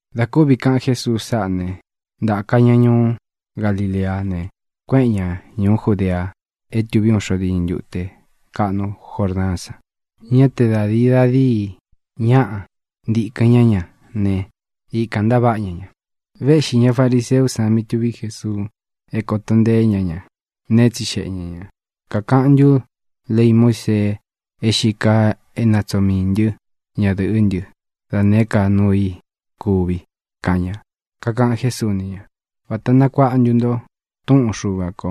Dā kúvi kaꞌan Jésuu sáꞌā né, ntāka ña ñuú Galileá ne, kuéꞌen ña ñūú Judea é tuví uun xo diñɨ ntute kaꞌnu Jordaán san. Ñá te da dīi da díi ñaꞌa ntīkɨn ñá ña ne, ikān ntaváꞌa ña ña. Véꞌxī ña fariseú san mí tuví Jesuu é kōto nteé ña ña ne, tsixeꞌe ña ñā: —¿Kākaꞌan ntú lei Muísee é xīi kaa é natsoo miī ntɨ́ ñadɨ̄ꞌɨ́ ntɨ dá nēé ka nuu i kuvi? —kaꞌan ña. Kakaꞌan Jésuu ni ña: —¿Vāta nakuáꞌa ntu nto túꞌun Xuva kō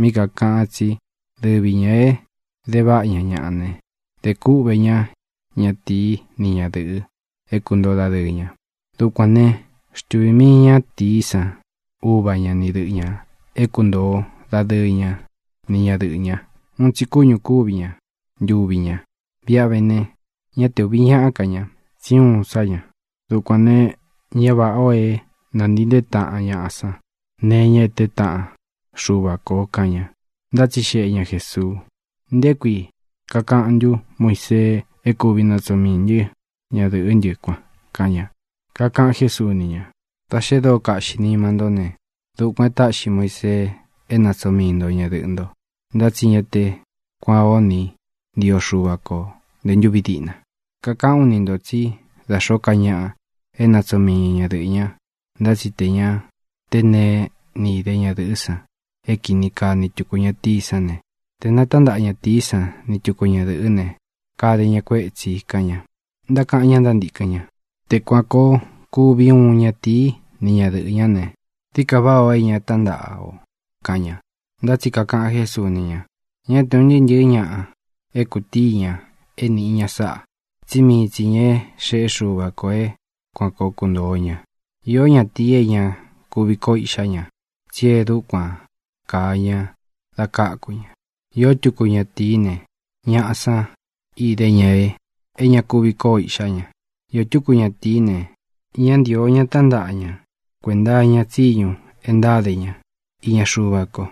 mí kākaꞌan tsí dɨvi ñā é dēváꞌa ña ñaꞌa ne, dē kúꞌvē ñá ñatīí ni ñadɨ̄ꞌɨ é kuntōo dadɨɨ ña? Dukuān né, xtuvī mii ñátīí san uva ña ni dɨꞌɨ ñā é kuntōo dadɨ́ɨ ña ni ñadɨꞌɨ̄ ña. Uun tsi kúñū kúvi ña ntuvi ña. Viꞌi a vé ne, ñá te ūvi ñáꞌa ká ña, tsí uun sá ña. Dukuān ne, ña váꞌā o é nantii ntee taꞌan ñāꞌa san neé e teé taꞌan Xuva kō —kaꞌan ña. Ntátsixeꞌe ña Jēsuu: —¿Nté kui kakaꞌan ntú Muisee é kuvi natsoo miī ntɨ́ ñadɨ̄ꞌɨ́ ntɨ kuan? —kaꞌan ña. Kakaꞌan Jésuu ni ña: —Dā xe dóo kaꞌxi nima ntó ne, dukuān e táꞌxi Muisee é natsoo mii nto ñadɨꞌɨ̄ nto, ntá tsi ña te kuán o ni ntio Xuva ko nte ntúvi diꞌna. Kakaꞌán u ni ntō tsí da xōó ka ñaꞌa é natsoo mii ña ñadɨꞌɨ̄ ña, ntá tsi tē ña te neé ni ide ñadɨ̄ꞌɨ́ san é kini kaa ni tuku ñatīí san ne, tē natántaꞌa ñatīí san ni tuku ñadɨ̄ꞌɨ́ ne, kade ña kuētsi —kaꞌan ña. Ntákaꞌan ña ntántīkɨn ña: —Te kuan kōo kuvi uun ñatīí ni ñadɨꞌɨ̄ ñá ne, dií ka váꞌā ó ē ña tántaꞌa ō —kaꞌan ña. Ntá tsi kakaꞌan Jésuu ni ña: —Ñá te ūn ntɨɨ́ ntɨ̄ɨ́ ñaꞌa é kūtíi ña é nīꞌi ña sáꞌā, tsí mii tsi ñā é xeꞌe Xúva kō é kuan koo kuntōo ña. Īó ñatīi é ña kuvi kóo iꞌxá ña, tsi e dúkuan kāa ña da káku ña. Iō túku ñatīí ne, ñaꞌa san ide ña e ña kuvi koo iꞌxá ña. Iō túku ñatīí ne, ña ntío ña tántaꞌa ña kuenta iña tsiñu e ntáde ña iña Xuva ko.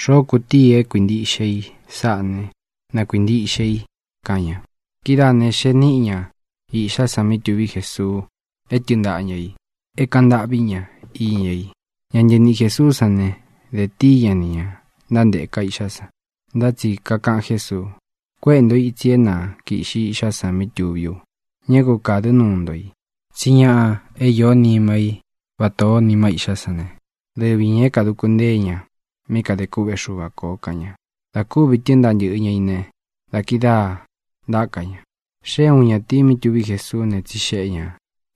Xoo kutíi i e kuintíꞌxe i sáꞌā né, na kuīntiꞌxe i —kaꞌan ña. Kidáā ne, xee níꞌi ña īꞌxá san mí tuví Jesuu é tɨɨn ntaꞌa ñā í, é kāꞌan ntâꞌví ña iña i. Ña ntɨniꞌi Jēsuú san ne, de tíi ña ni ñā ntánteka iꞌxá san, ntá tsi kakaꞌan Jésuu: —Kuéꞌe ntō itsi é na kīꞌxi iꞌxá san mí tuví u. Ñá ku kādɨ́ nuu nto i, tsí ñaꞌa é īó nima í vatā ó nima íꞌxá san ne, dɨvi ñā é kāduku ntée ña mí kadē kûꞌvé Xuva kō —kaꞌan ña. Dā kúvi tɨ́ɨn ntaꞌa ntɨꞌɨ ña ī ne, da kidáā ntáka ña. Xée uun ñatīi mí tuví Jesuú ne, tsixeꞌe ñā: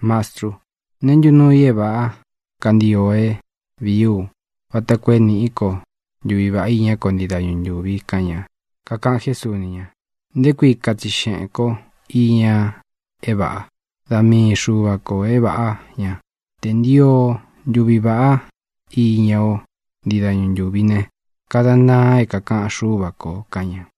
—Mastrú, ¿neé ntu nuu i é vāꞌá kantio é vīí u vata koo é nīꞌí ko ntuví vaꞌá iñá ko ntii dañu ntūvi? —kaꞌan ña. Kakaꞌan Jésuu ni ña: —¿Nté kui katsixeꞌēn kó iña é vāꞌa? Da mii Xuva kō é vāꞌá ña. Te ntio o ntuvi vāꞌá iña o ntii dañu ntúvi ne, kadan ntaan é kākaꞌan Xúva kō —kaꞌan ña.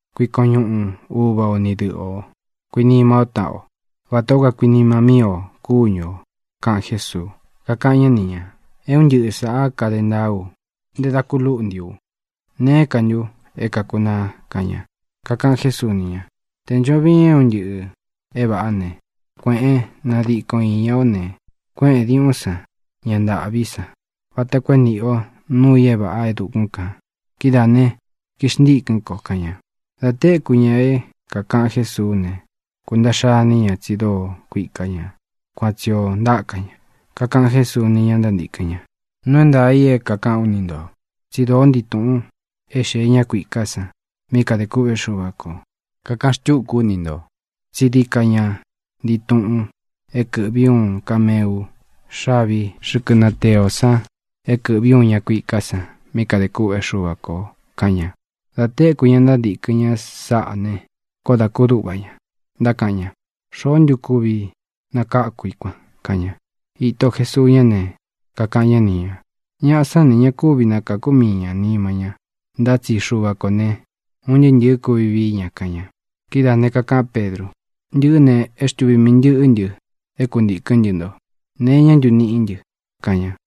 Kuikon ñuꞌun uva o ni dɨꞌɨ ō. Kuinima ó taꞌan o vatā ó kakuinima míi ō kúñu ō —kaꞌan Jésuu. Kakaꞌan ñá ni ñā: —É un ntɨꞌɨ sāꞌá kade ntaa ú ntē da ku lúꞌntī u. ¿Neé ka ntu é kākunaa? —kaꞌan ña. Kakaꞌan Jésuu ni ña: —Tē ncho viin é un ntɨꞌɨ̄ é vāꞌá ne, kuēꞌén, nadikon īña o ne, kuéꞌēn diuꞌún san ña ntāꞌví san vata koo e níꞌi o nuu i é vāꞌa é dukún kān. Kidáā né, kixntikɨ̄n ko —kaꞌan ña. Dā téku ña é kākaꞌan Jésuú ne, kuntaꞌxa iní ña, tsi dóo kuika ña. Kuan tsi ō ntaka ña. Kakaꞌan Jésuu ni ñá ntántīkɨn ña: —Nuu é ntaā i é kākaꞌán u ni ntō. Tsi dóo ntii tuꞌun é xee ñá kuiká san mí kadē kûꞌvé Xuva kō. Kakaꞌán xtuku ú ni ntō tsí dií ka ña ntii tuꞌun é kɨ̄ꞌví uun kameu xávī xɨ́kɨ natee ō san é kɨ̄ꞌví uun ña kuiká san mí kadē kûꞌvé Xuva kō —kaꞌan ña. Dā téku ña ntántīkɨn ñá sáꞌā ne, koó dā kúduꞌva ña. Ntákaꞌan ña: —¿Xoó ntu kūvi nakáku i kuan? —kaꞌan ña. Īto Jesuu ñá ne, kakaꞌan ñá ni ñā: —Ñaꞌa sán ne, ña kúvi nakākú mii ña nima ñá, ntá tsi Xuva kō ne, un ntɨɨ́ ntɨ̄ɨ́ kuvi vií ña —kaꞌan ña. Kidáā ne, kakaꞌán Pedru: —Ntɨꞌɨ́ ne, é xtuvī mii ntɨꞌɨ́ ntɨ é kuntīkɨ́n ntɨ nto. ¿Nee iñá ntu niꞌi ntɨ? —kaꞌan ña.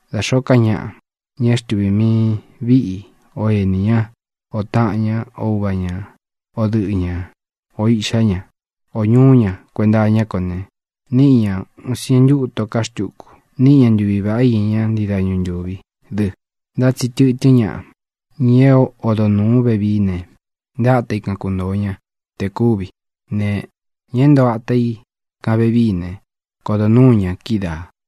Da xōó ka ñaꞌa, ña é xtuvī mii i viꞌi i, ō ení ña, ō taꞌan ñá, o uva ñā, o dɨꞌɨ ñā, ō iꞌxá ña, o ñūꞌu ña kuenta iñá ko ne, níꞌi ña ūun sientu íto ká xtuku. Níꞌi ña ntuvi vāꞌá iña ña ntii dañu ntúvi dɨ. Ntá tsi tɨtɨ́n ñaꞌa, ña é odo nūu vevií ne, nte áta i kan kuntōo ña te kúvi ne, ña é ntoo ata i kān vevií ne, kodo nuū ñá kídaā.